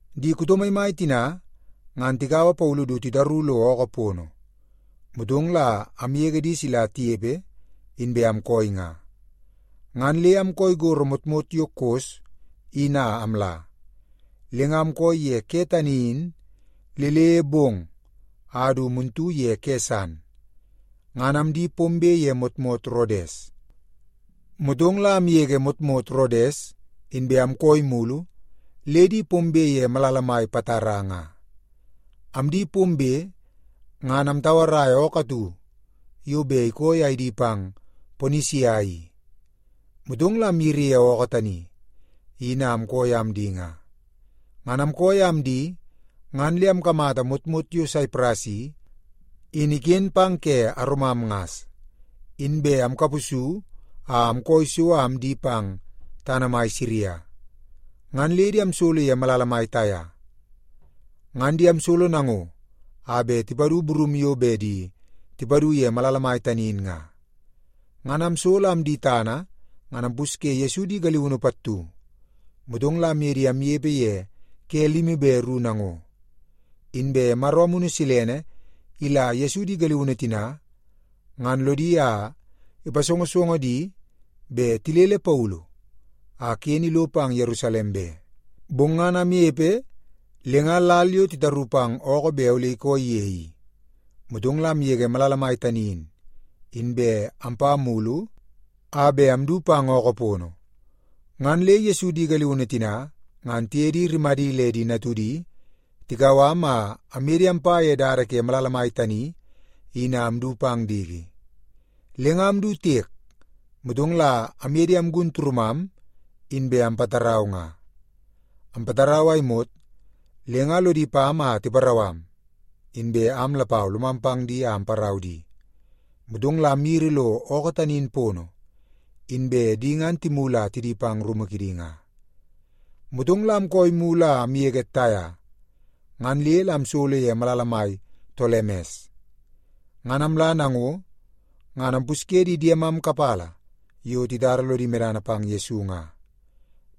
Di kuto maimai tina ngan tikaua Paulu du titaru lo ookoo pono, motong la amgege di sila tinepe inbe amkooi nga, ngan le amkooi gorro motmot yo Kos in a amla. Le nga amkooi ye ke tani in le le bong a du muntu ye ke san, ngan amdi pombe ye motmot Rodes. Motong la amgege motmot Rodes, inbe amkooi mulu le di pombe ye malala mai Patara nga. Amdi pombe, ngan amtauaraia ookoo atu yo bet ikooi a idi pang Ponisia i. Motong la amyiri ye ookoo tani in a amkooi a amdi nga. Ngan amkooi a amdi ngan le amkamata motmot yo Saipras i, in iken pang ke aromam ngas. Inbe amkapusu a amkooi so a amdi pang tana mai Siria, ngan le di amsolo ye malala mai Taia. Ngan di amsolo nango a bet tipadu burum yo bet di tipadu ye malala mai tani in nga. Ngan amsolo a amdi tana ngan ampusye Yesu di galiunu pattu, motong la amye di amnepe ye ke limi be ru nango. Inbe Maro Amunu Silene ila Yesu di galiunu tina ngan lodi a ipasongosongo di bet tilele Paulu a ken ilo pang Yerusalem be. Bong ngan amnepe le nga lal yo titaru pang ookoo bet ole ikooi ye i, motong la amgege malala mai tani in, inbe ampa mulu a bet amdu pang ookoo pono. Ngan le Yesu di galiunu tina ngan tiye di rimadi le di natudi tikau am a amye di ampa ye dada ke malala mai tani in a amdu pang diki. Le nga amdu tiek, motong la amye di amgun turumam inbe ampatarau nga. Ampatarau a imot, le nga lodi pam a tiparau am, inbe am lapau lomam pang di a amparau di. Motong la amyiri lo ookoo tani in pono, inbe di ngan timulu a tidi pang rumu kidi nga. Motong la amkooi mulu a amgege Taia, ngan le la amsolo ye malala mai Tolemes. Ngan amla nango, ngan ampusye di diemam kapala yo titara lodi medana pang Yesu nga,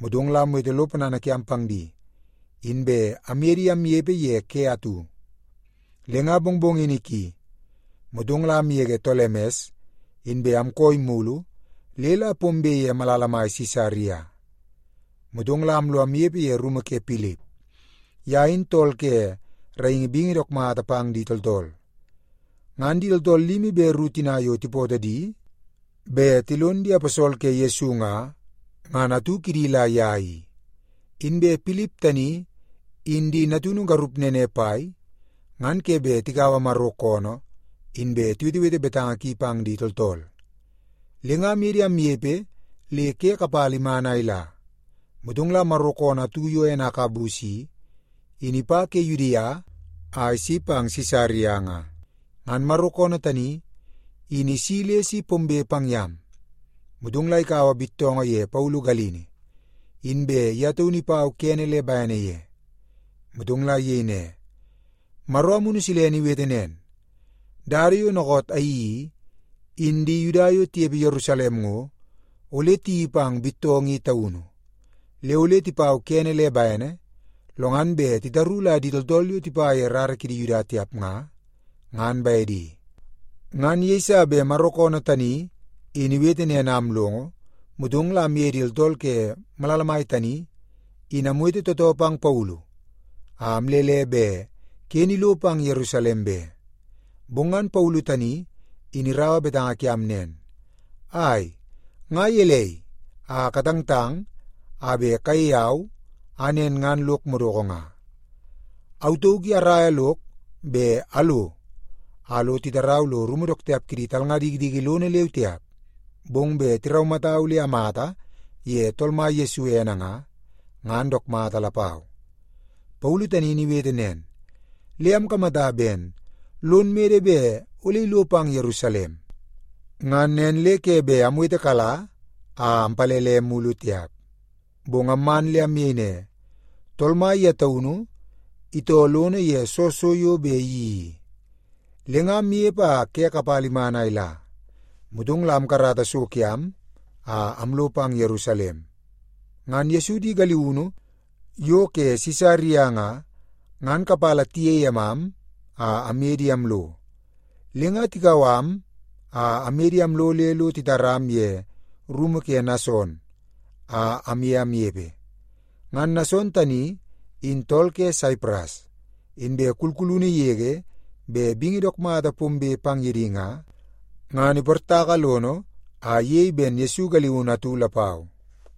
motong la amwete lo ponana kiam pang di, inbe amye di amnepe ye ke atu. Le nga mongmongini ki, motong la amgege Tolemes, inbe amkooi mulu le la pombe ye malala mai Sisaria. Motong la amlo amnepe ye rumu ke Pilip. Ye in tool ke raingi bingi dook mata pang di tooltool. Ngan di tooltool limi be ru tina yo tipootoo di bet tilon di aposol ke Yesu nga, ngan atu kidi la ye i. Inbe Pilip tani in di natunu garup nene pai ngan ke bet tikaua Maro koonoo inbe tiwetewete betanga ki pang di tooltool. Le nga amye di amnepe le ke kapala iman a ila, motong la Maro koonoo atu yo ene Agabus i, in ipa ke Yudia a isi pang Sisaria nga. Ngan Maro koonoo tani in isi le si pombe pang yam, motong la ikaua bittoongoo ye Paulu galini, inbe ye taunu ipau kene le bene ye, motong la iyei ne, “Maro Amunu Silene iwete nen, ‘Dada yo dookoot ayeii i, in di Yuda yo tinepe Yerusalem ngo, ole tiyeii pang bittoongoo i taunu, le ole tipau kene le bene, lo ngan bet titaru la di tooltool yo tipa ye rara kidi Yuda tiap nga, ngan bedi.’” Ngan yeiso bet Maro koonoo tani in iwete nen a amlongo, motong la amye di tooltool ke malala mai tani in amwete tootoo pang Paulu a amlele bet ken ilo pang Yerusalem be. Bong ngan Paulu tani in iraua betanga kiam nen, “Ai, nga gelei a katangtang a bet kayei au a nen ngan lok madoko nga? Au tauk i araia lok bet alo a lo titarau lo rumu dook tiap kidi talnga dikidiki lono leu tiap, bong bet tiraumatau le amata ye Tool Mai Yesu ene nga, ngan dook mata lapau.” Paulu tani in iwete nen, le amkamata ben lon mede bet ole ilo pang Yerusalem. Ngan nen le ke bet amwetekala a ampalele mulu tiap. Bong amman le amyei ne, “Tool Mai ye taunu itoo lono ye soo so yo bet iyeii i.” Le nga amnepe a ke kapala iman a ila, motong la amkarata so kiam a amlo pang Yerusalem. Ngan Yesu di galiunu yo ke Sisaria nga, ngan kapala tiyei emam a amye di amlo. Le nga tikau am a aye di amlo le lo titaram ye rumu ke Nason a amye amnepe. Ngan Nason tani in tool ke Saipras, inbe kulkulunu yege bet bingi dook mata pombe pang ye di nga, ngan iportaka lono a iyei ben Yesu galiunu atu lapau.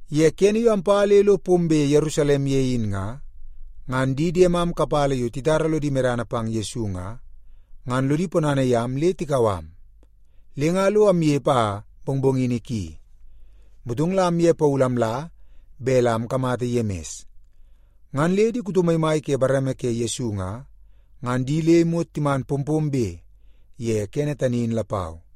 Ye kene yo ampa le lo pombe Yerusalem ye in nga, ngan di diemam kapala yo titara lodi medana pang Yesu nga, ngan lodi ponana yam le tikau am. Le nga lo amnepe a mongmongini ki, motong la amye Paulu amla bet la ikamata Yemis. Ngan le di kuto maimai ke bareme ke Yesu nga, ngan di le imot timan pompombe ye kene tani in lapau.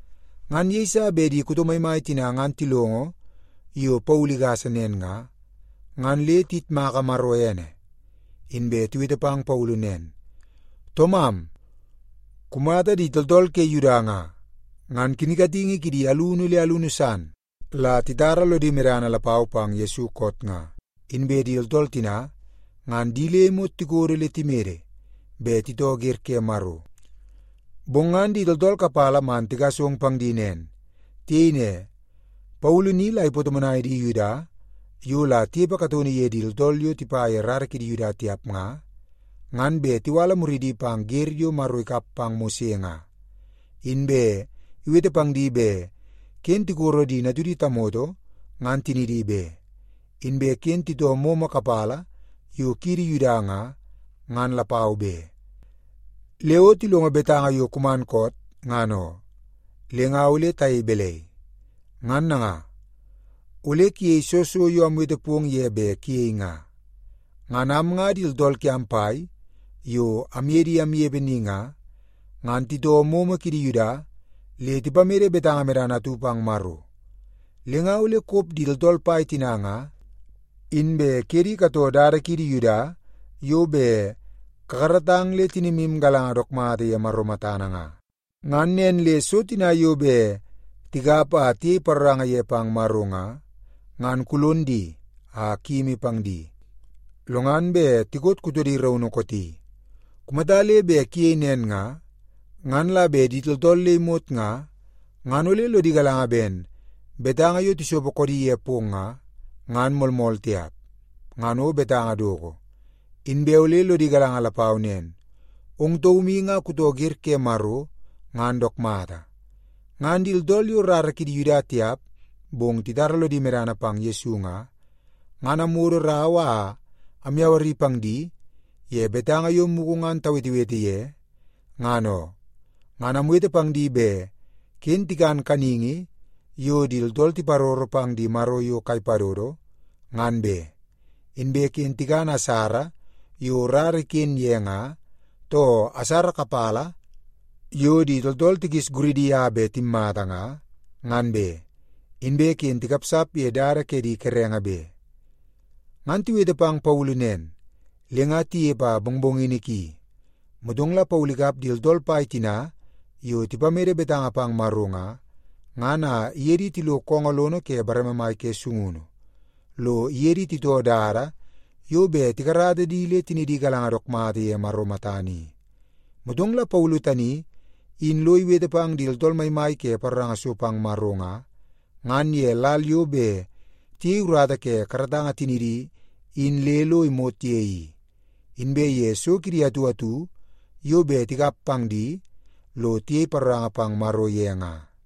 Ngan yeiso bet di kuto maimai tina ngan tilongo yo Paulu igasa nen nga, ngan le tiyitmaka Maro ene. Inbe tiwete pang Paulu nen, “Toomam, kumata di tooltool ke Yuda nga, ngan kinkatingi kidi alunu le alunu san la titara lodi medana lapau pang Yesu koot nga. Inbe di tooltool tina ngan di le imot tikodo le timede bet titoo wer ke Maro. Bong ngan di tooltool kapala man tigasong pang di nen. Tiyei ne, ‘Paulu ni la ipatomonai di Yuda yo la tinepe kataunu ye di tooltool yo tipa ye rara kidi Yuda tiap nga, ngan bet tiwala muridi pang wer yo Maro ikap pang Mose nga. Inbe iwete pang di bet ken tikoro di natudi tamoto ngan tinidi be, inbe ken titoo momo kapala yo kiidi Yuda nga, ngan lapau be.’ Le o tilongo betanga yo kuman koot, ngan oo, le nga ole tayei balai? Ngan nanga, ole kuyei soo so yo amwete pong ye bet kuyei nga. Ngan am nga di tooltool kiam pai yo amye di amnepe ni nga, ngan titoo momo kidi Yuda le tipamede betanga medana atu pang Maro. Le nga ole kop di tooltool pai tina nga, inbe kuye di katoo dada kiidi Yuda yo bet kakaratang le tinimu galanga dook mata ye Maro matana nga. Ngan nen le so tina yo bet tikap a tiyei paroranga ye pang Maro nga, ngan kulon di a kuyimi pang di, lo ngan bet tikot kutodi raunu kooti. Kumata le bet kuyei nen nga, ngan la bet di tooltool le imot nga, ngan ole lodi galanga ben betanga yo tisopo koodi ye pong nga, ngan moolmool tiap, ngan o betanga doko. Inbe ole lodi galanga lapau nen, ong taum i nga kutoo wer ke Maro ngan dook mata. Ngan di tooltool yo rara kidi Yuda tiap bong titara lodi medana pang Yesu nga, ngan amwodo rau a amyawari pang di ye betanga yo mugu ngan tawetewete ye, ngan oo. Ngan amwete pang di bet ken tikan kaningi yo di tooltool tiparoro pang di maro yo kai padodo, ngan be. Inbe ken tikan asara yo rara iken ye nga, too asara kapala yo di tooltool tikis guridi a bet timmata nga, ngan be. Inbe ken tikapsap ye dada ke di kerenge be.” Ngan tiwete pang Paulu nen, le nga tinepe a mongmongini ki, motong la Paulu ikap di tooltool pai tina yo tipamede betanga pang Maro nga, ngan a iye di tilo koongoo lono ke bareme mai ke sungunu, lo iye di titoo dada yo bet tikarata di le tinidi galanga dook mata ye Maro matana i. Motong la Paulu tani in lo iwete pang di tooltool maimai ke paroranga so pang Maro nga, ngan ye lal yo bet tiyei urata ke karatanga tinidi in le lo imot ye i, inbe ye so kidi atu atu yo bet tikap pang di lo tiyei paroranga pang Maro ye nga.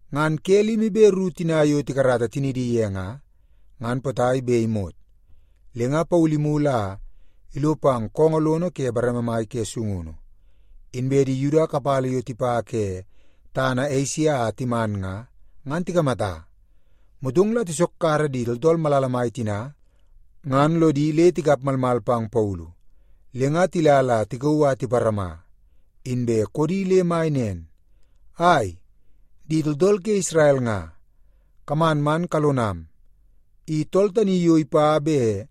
Ngan ke limi be ru tina yo tikarata tinidi ye nga, ngan potai bet imot, le nga Paulu imulu a ilo pang koongoo lono ke bareme mai ke sungunu, inbe di Yuda kapala yo tipa ke tana Esia a timan nga, ngan tikamata. Motong la tisokkara di tooltool malala mai tina ngan lodi le tikap malmal pang Paulu, le nga tila la tikauu a tiparama, inbe koodi le mai nen, “Ai, di tooltool ke Isrel nga, kaman man kalonam! I tool tani yo ipa bet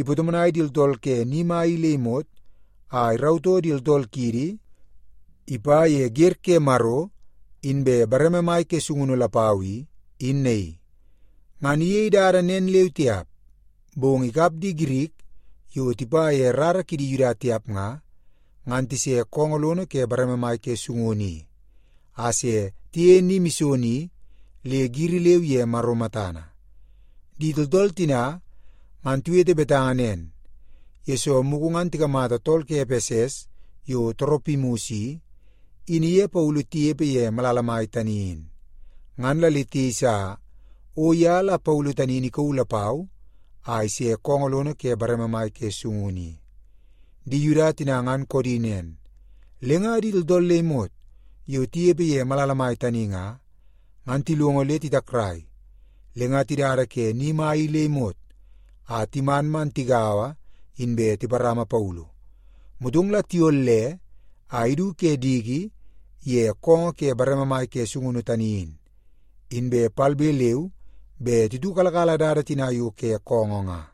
ipatomonai di tooltool ke ni mai i le imot a irautoo di tooltool kiidi ipa ye wer ke Maro inbe bareme mai ke sungunu lapau i, in naii. Ngan iyei dada nen leu tiap, bong ikap di Girik yo tipa ye rara kidi Yuda tiap nga, ngan tise koongoo lono ke bareme mai ke sungunu i a se tiyeie ni mison i, le giri leu ye Maro matana.” (Di tooltool tina ngan tiwete betanga nen, yesoo mugu ngan tikamata tool ke Epeses yo Toropimus i, in iye Paulu tinepe ye malala mai tani in. Ngan la le tiyeisa o ye la Paulu tani in ikauu lapau a ise koongoo lono ke bareme mai ke sungunu i.) Di Yuda tina ngan koodi nen, le nga di tooltool le imot yo tinepe ye malala mai tani nga, ngan tilongo le titakrai. Le nga tidada ke ni mai i le imot a timan man tigaua inbe tiparama Paulu, motong la tiyolle a idu ke diki ye koongoo ke bareme mai ke sungunu tani in. Inbe palbe leu be titiukalakala dada tina yo ke koongoo nga.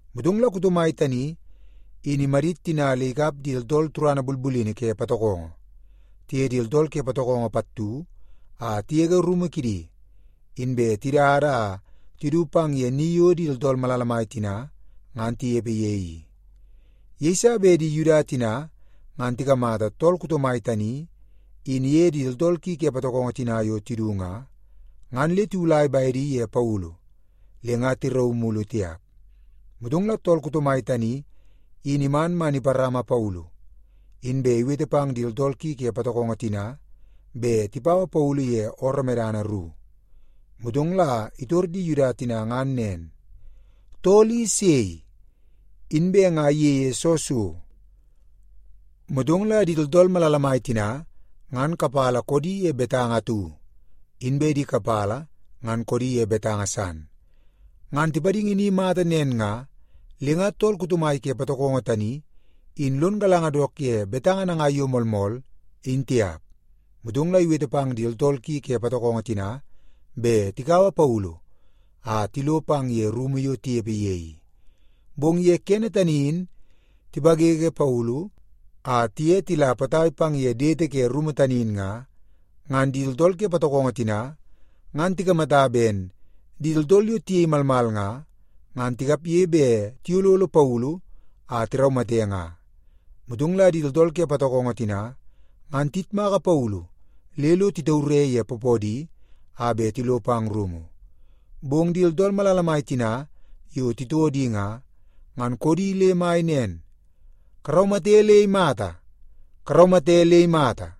Motong la kuto mai tani in imadit tina le ikap di tooltool turana bulbulini ke patokongo, tiye di tooltool ke patokongo pattu a tigege rumu kidi, inbe tidada a tidu pang ye ni yo di tooltool malala mai tina ngan tinepe ye i. Yeiso bet di Yuda tina ngan tikamata tool kuto mai tani in iye di tooltool ki ke patokongo tina yo tidu nga, ngan le tiwulai bedi ye Paulu le nga tirauu mulu tiap. Motong la tool kuto mai tani in iman man iparama Paulu, inbe iwete pang di tooltool ki ke patokongo tina bet tipaua Paulu ye ooroo medana ru. Motong la itor di Yuda tina ngan nen, “Tool i sei? Inbe nga iyeie soo so?” Motong la di tooltool malala mai tina ngan kapala koodi ye betanga atu, inbe di kapala ngan koodi ye betanga san. Ngan tipadingi ni mata nen nga, le nga tool kuto mai ke patokongo tani in lon galanga dook ye betanga nangai yo moolmool, in tiap. Motong la iwete pang di tooltool ki ke patokongo tina bet tikaua Paulu a tilo pang ye rumu yo tinepe ye i. Bong ye kene tani in tipawewe Paulu a tiye tila potai pang ye dete ke rumu tani in nga, ngan di tooltool ke patokongo tina ngan tikamata ben di tooltool yo tiyei malmal nga, ngan tikapge bet tiyololo Paulu a tiraumate nga. Motong la di tooltool ke patokongo tina ngan tiyitmaka Paulu le lo titaure ye poopoodi a bet tilo pang rumu. Bong di tooltool malala mai tina yo titoo di nga, ngan koodi le mai nen, “Karaumate le imata! Karaumate le imata!”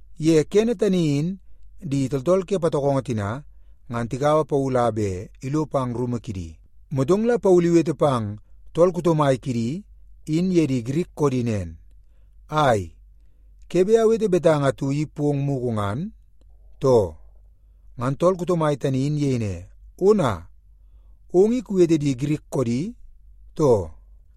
Ye kene tani in di tooltool ke patokongo tina ngan tikaua Paulu a bet ilo pang rumu kidi, motong la Paulu iwete pang tool kuto mai kidi in ye di Girik koodi nen, “Ai, ke bet awete betanga atu i pong mugu ngan, too?” Ngan tool kuto mai tani in iyei ne, “Ona, ong i kuwete di Girik koodi, too?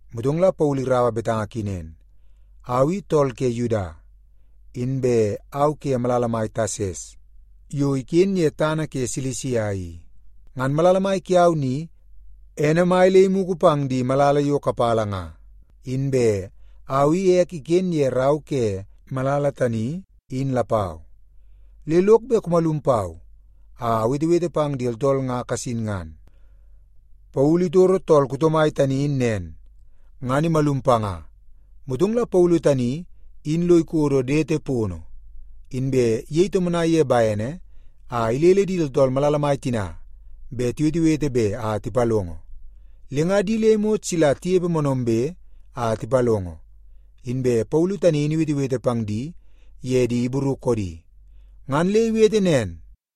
Motong la Paulu iraua betanga ki nen, “Au i tool ke Yuda, inbe au ke malala mai Tasas yo iken ye tana ke Silisia i. Ngan malala mai kiau ni, ene mai le imugu pang di malala yo kapala nga, inbe au i ek iken ye rau ke malala tani in lapau. Le lok bet kumalum pau a awetewete pang di tooltool nga kasin ngan.” Paulu itoro tool kuto mai tani in nen, ngan imalum panga. Motong la Paulu tani in lo ikodo dete pono, inbe iyei tomonai ye bene a ilele di tooltool malala mai tina bet tiwetewete be a tipalongo. Le nga di le imot sila tinepe moonoombe a tipalongo, inbe Paulu tani in iwetewete pang di ye di Ibru koodi. Ngan le iwete nen,